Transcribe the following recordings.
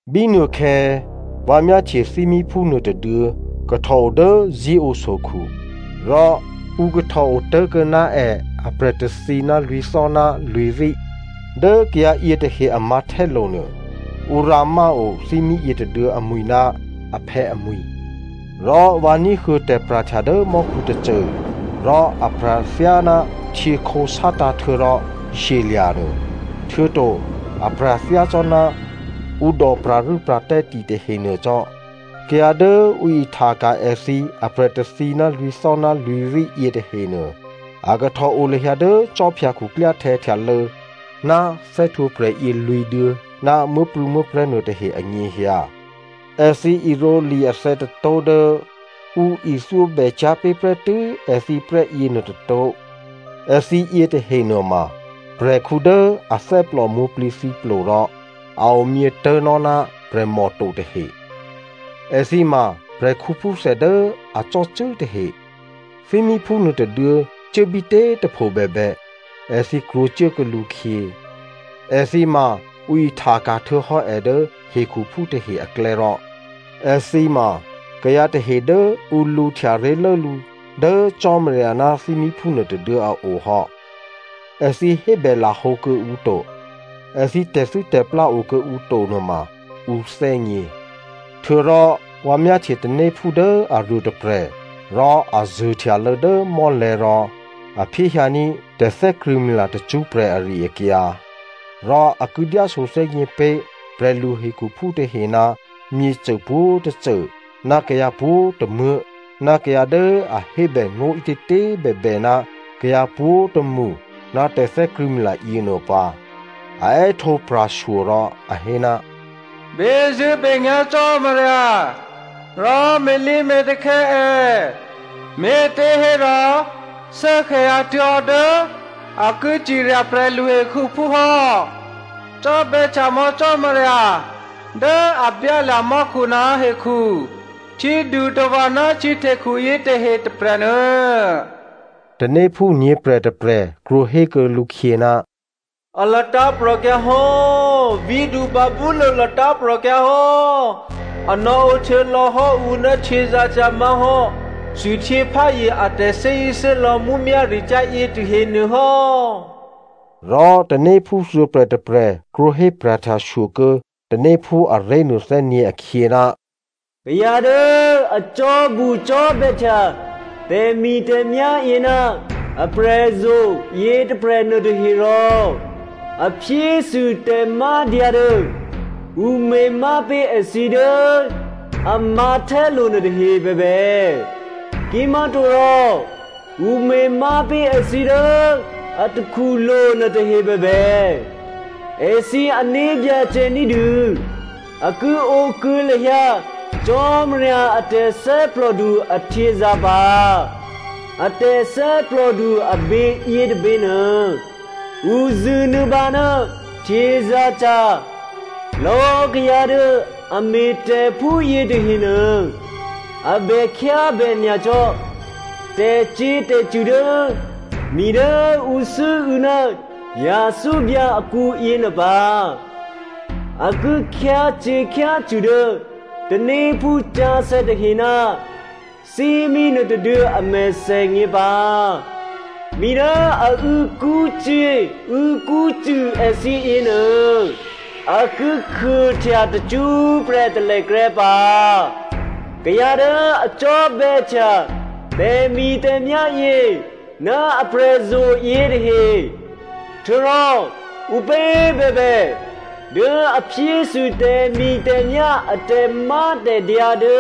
Bínuôkhè̌, vǎ myáhtye thímíphú nuôtôduô̌ kahtòo dố Zion sokhu. Rò ǔ kahtò otố̤kuô̌ ná è aprè̤ tôthǐ ná lwǐ̤thò́ ná lwǐ̤rí. Dố kayǎ yětahe a mǎ̤htè́lo̤ nuô, ǔ rǎmáo thímí yětôduô̌ amwi̤ ná aphè̌ amwi̤. Rò vǎ ní̤huô̌ tè̤pra̤htya dố mò́khu tôcô rò a pra̤ thyáná htyěkhǒ sátǎ̤ htuô̌rò shyelya̤ nuô. Htuô̌to a pra̤ thyácò́ná ǔ dò pra̤rû́pra̤tè́ ti tahenuô cò́. Kayǎ dố ǔ ihtaka̤ èthǐ aprè̤ tôthǐ ná lwǐ̤thò́ ná lwǐ̤rí yětahenuô, a kahtòo lahyǎ dố khwí khuklyáhtè̌ htyalô̌ ná thè́htwǒprè̤ yě lwǐ̤duô̌ ná muố̤prû̌muố̤prè̤́ nuôtahe anyěhyǎ. Èthǐ irǒli athè̌ tôtó̤ dố ǔ ithyóbècyá̤ pé̤ prè́tû́ èthǐ prè́ yěnuô tôtó̤. Èthǐ yětahe nuôma prè̤khǔ dố athè́plò mwǒ̤plǐthǐplo rò a omyě tố̤nò́ ná prè̤mò to tahe. Èthǐ ma prè̤khǔphúthè dố a cò́cû́ tahe. Thímíphú nuôtôduô̌ cuốbítě꤮ tôpho bèbè, èthǐ krwǒcuốkuô̌ lǔkhyě. Èthǐ ma ǔ ihtaka̤ htuô̌hò́ è dố hekhuphú tahe aklè̌ rò èthǐ ma kayǎ tahe dố ǔ lǔhtya ré̤lố lǔ dố Cò́marya ná thímíphú nuôtôduô̌ a o hò́. Èthǐ hébè lahǒ kuô̌ǔ to. Èthǐ tè̤thû́tè̤plá okuô̌ǔ to nuôma ǔ thè́gně. Htuô̌rò vǎ myáhtye tanéphú dố aruôtôprè̤ rò a zuô̤htyalô̌ dố mò́lè̤̌ rò a phyéhyǎní̤ tè̤thè́krṳ̂̌mila tacṳ́prè̤ ari-akyǎ. Rò a ki dyáso thè́gněpé̤ prè̤lu hekhuphú tahe ná myěcô pwǒ̤tôcô, ná kayǎ pwǒ̤tômuố̤, ná kayǎ dố a hébè ngó̤ ǐtětě꤮ bèbè ná kayǎ pwǒ̤tômṳ ná tè̤thè́krṳ̂̌mila yěnuô pǎ. A è́htǒ pra̤shyo rò a hé, “Bezṳ̂́benyá̤ Cò́marya rò me̤lǐme̤takhè̌ è, me̤těhérò shuốkhè̌ hyǎtuố̤hò́ dố a ki cirya prè̤lu hekhuphú hò́. Cò́bè̌htya mò̌ Cò́marya dố a byálya̤ mò́khu ná hekhu htyědutava̤ ná htyěhtekhu yětahe tôprè̤nuô.” Tanéphú nyě̤prè̤ tôprè̤ krwǒhékuô̌ lǔkhyě, “A latǎ̤prò̤kyǎ hò́, vǐ̤du Babylonia latǎ̤prò̤kyǎ hò́, a nò̌ǒ htuô̌lò̌hò́ ǔ ná htyězǎ̤cyǎ má̤hò́ thwihtyěpházye a tè̤thè́zṳ̂́thè́lò̌ mǔmyá̤ricyá̤ yětahe nuôhò́.” Rò tanéphú thuô̌prè̤ tôprè̤ krwǒhé pra̤htyashyo kuô̌ tanéphú aré̤ nuôthè́nyě̤ akhyě, “Kayǎ dố a cò́bucò́bè̌htya tè̤mi̤tè̤myá̤ yě ná aprè̤zo̤ yětôprè̤ nuôtahe rò a phyésû tè̤mádyǎ dố ǔ me̤má pé̤ èthǐ dố a mǎ̤htè́lo̤ nuôtahe bèbè, kimá̤torò ǔ me̤má pé̤ èthǐ dố a takhulo̤ nuôtahe bèbè, èthǐ ané̤byacè ní̤dû a ki ǒ kuô̌ lahyǎ Cò́marya a tè̤thè́plòdu ahtyězǎ̤ pǎ. A tè̤thè́plòdu abě yětôbě nuô, ǔ zṳ̂nuô̌bǎ ná htyězǎ̤cyǎ. Lò̌꤮ kayǎ dố a me̤tè̤ phúyě tahenuô a bè khyábè nyacò́ tè̤cyě̤tè̤cṳ̂ dố mi dố ǔ sû́û̌ ná yathúbyǎ akǔ yěnuô pǎ. A ki khyácyě̤khyácṳ̂ dố tanéphú sǎsè̌ tahe ná thímí nuôtôduô̌ a mèthènyě pǎ. Mi dố a û̌kṳ́cyě̤ û̌kṳ́cṳ̂ èthǐ yěnuô, a ki khuôhtya tacṳ́prè̤ talèkrè́ pǎ. Kayǎ dố a cò́bè̌htya tè̤mi̤tè̤myá̤ yě, ná aprè̤zo̤ yětahe, htuô̌rò ǔpě꤮ bèbè dố a phyésû tè̤mi̤tè̤myá̤ a tè̤mátè̤dyǎ dố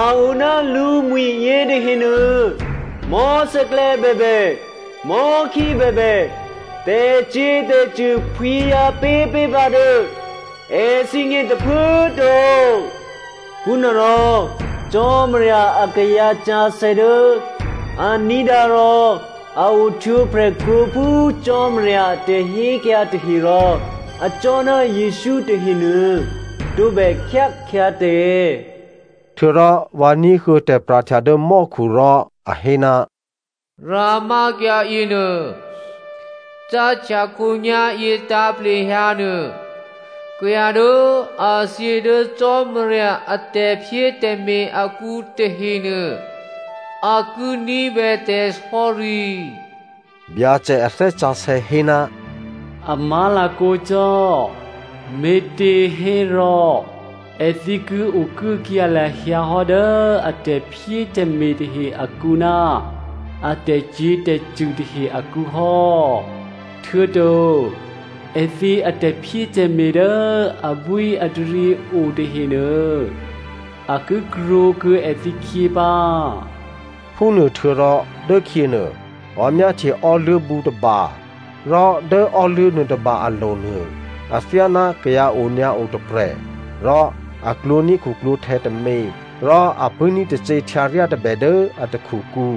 a o ná lǔmwi̤ yětahenuô, mò̤́sè̌klè̌ bèbè, mò̤́khí bèbè, tè̤cyě̤tè̤cṳ̂ phwǐhyǎpé̤ pé̤ pǎ dố èthǐgně tôphuố꤮ to.” Phúnuôrò Cò́marya akayǎ sǎsè̌ dố a ní̤dǎ rò a ohtwǒprè̤ krwǒ phú Cò́marya a tè̤hékyǎ tahe rò acò́ ná Jesǔ tahenuô, tǒbè khyá khyǎtè̤. Htuô̌rò vǎ ní̤huô̌ tè̤pra̤htya dố mò́khu rò a hé, “Rǎmákyǎ yěnuô, cáhtya khǒnyá̤yě tǎ̤plehyǎ nuô, kayǎ dố a thyě dố Cò́marya a tè̤phyétè̤me̤ akǔ tahenuô, a ki ní̤bè tè̤sò̌ri.” Byacè a Thè́ Sǎsè̌ hé, “A má̤lakǒ cò́. Me̤těhérò èthǐ ki okuốkyǎ lahyǎ hò́ dố a tè̤phyétè̤me̤ tahe akǔ ná a tè̤cyě̤tè̤cṳ̂ tahe akǔ hò́. Htuô̌to èthǐ atè̤phyétè̤me̤ dố abwíataryě o tahenuô, a ki krwǒkuô̌ èthǐkhyě pǎ.” Phúnuôhtuô̌rò dốkhyěnuô vǎ myáhtye ò́luố̤bǔ tôba, rò dố ò́luố̤ nuôtôba alo̤ nuô, athyáná kayǎ onyǎo tôprè̤ rò a klwǒ̤ní̤ khuklwǒ̤htè̌ tômě rò a pṳ̂́ní̤ tacě htyǎryá tôbè dố a takhukǔ.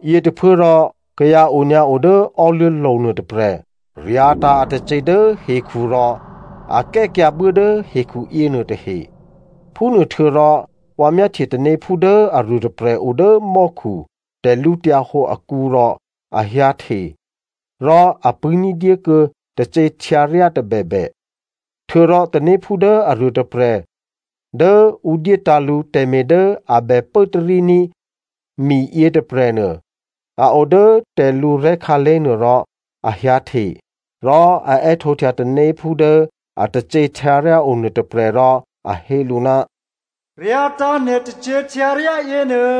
Yětôphuốrò kayǎ onyǎo dố ò́luố̤lo̤ nuôtôprè̤ ryǎ̤tǎ̤ atacě dố hekhu rò a kè́kyǎ buố dố hekhu yěnuô tahe. Phúnuôhtuô̌rò vǎ myáhtye tanéphú dố aruôtôprè̤ o dố mò́khu tè̤lǔhǒdu akǔ rò a hyǎhte rò a pṳ̂́ní̤ dyékuô̌ tacě htyǎryá tôbèbè. Htuô̌rò tanéphú dố aruô tôprè̤ dố ǔ dyétǎ̤ lǔ tè̤me̤ dố a bè pốtaríní̤ mi yětôprè̤nuô, a o dố tè̤lǔrè̤́ khǎlé̤ nuô rò a hyǎhte. Rò a è́htǒhtya tanéphú dố atacě htyǎryá o nuôtôprè̤ rò a hé lǔ, “Ryǎ̤tǎ̤ nè̤ tacě htyǎryá yěnuô,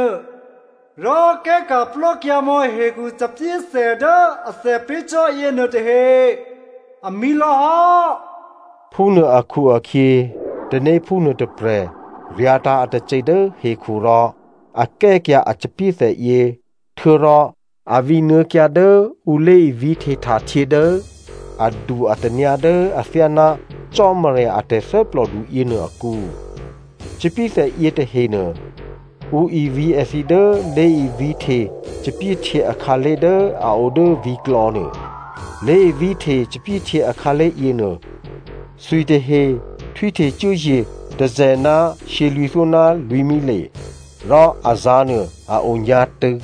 rò kè́ka̤plò́ kyǎmò̌ hekhu thòbǐthè dố athè pé̤ cò́ yěnuô tahe, amǐ lò̌hò́.” Phúnuô akhu-akhyě tanéphú nuôtôprè̤ ryǎ̤tǎ̤ atacě dố hekhu rò a kè́kyǎ a thòbǐthè yě htuô̌rò a vǐnuô̌kyǎ dố ǔ lé̤ivǐ̤hte htahtyě dố adu-atanyǎ dố athyáná Cò́marya a tè̤thè́plòdu yěnuô akǔ. Thòbǐthè yětahenuô, ǔ ivǐ̤ èthǐ dố lé̤ivǐ̤hte thòbǐthèhtyě akhǎlé̤ dố a o dố vǐ̤klò̌ nuô. Lé̤ivǐ̤hte thòbǐthèhtyě akhǎlé̤ yěnuô, thwitahe htwíhte cuốye̤ tôzè̤ ná shyělwǐ̤thyó ná lwǐ̤mile, rò azǎ̤ nuô a o nyǎ̤tṳ̂.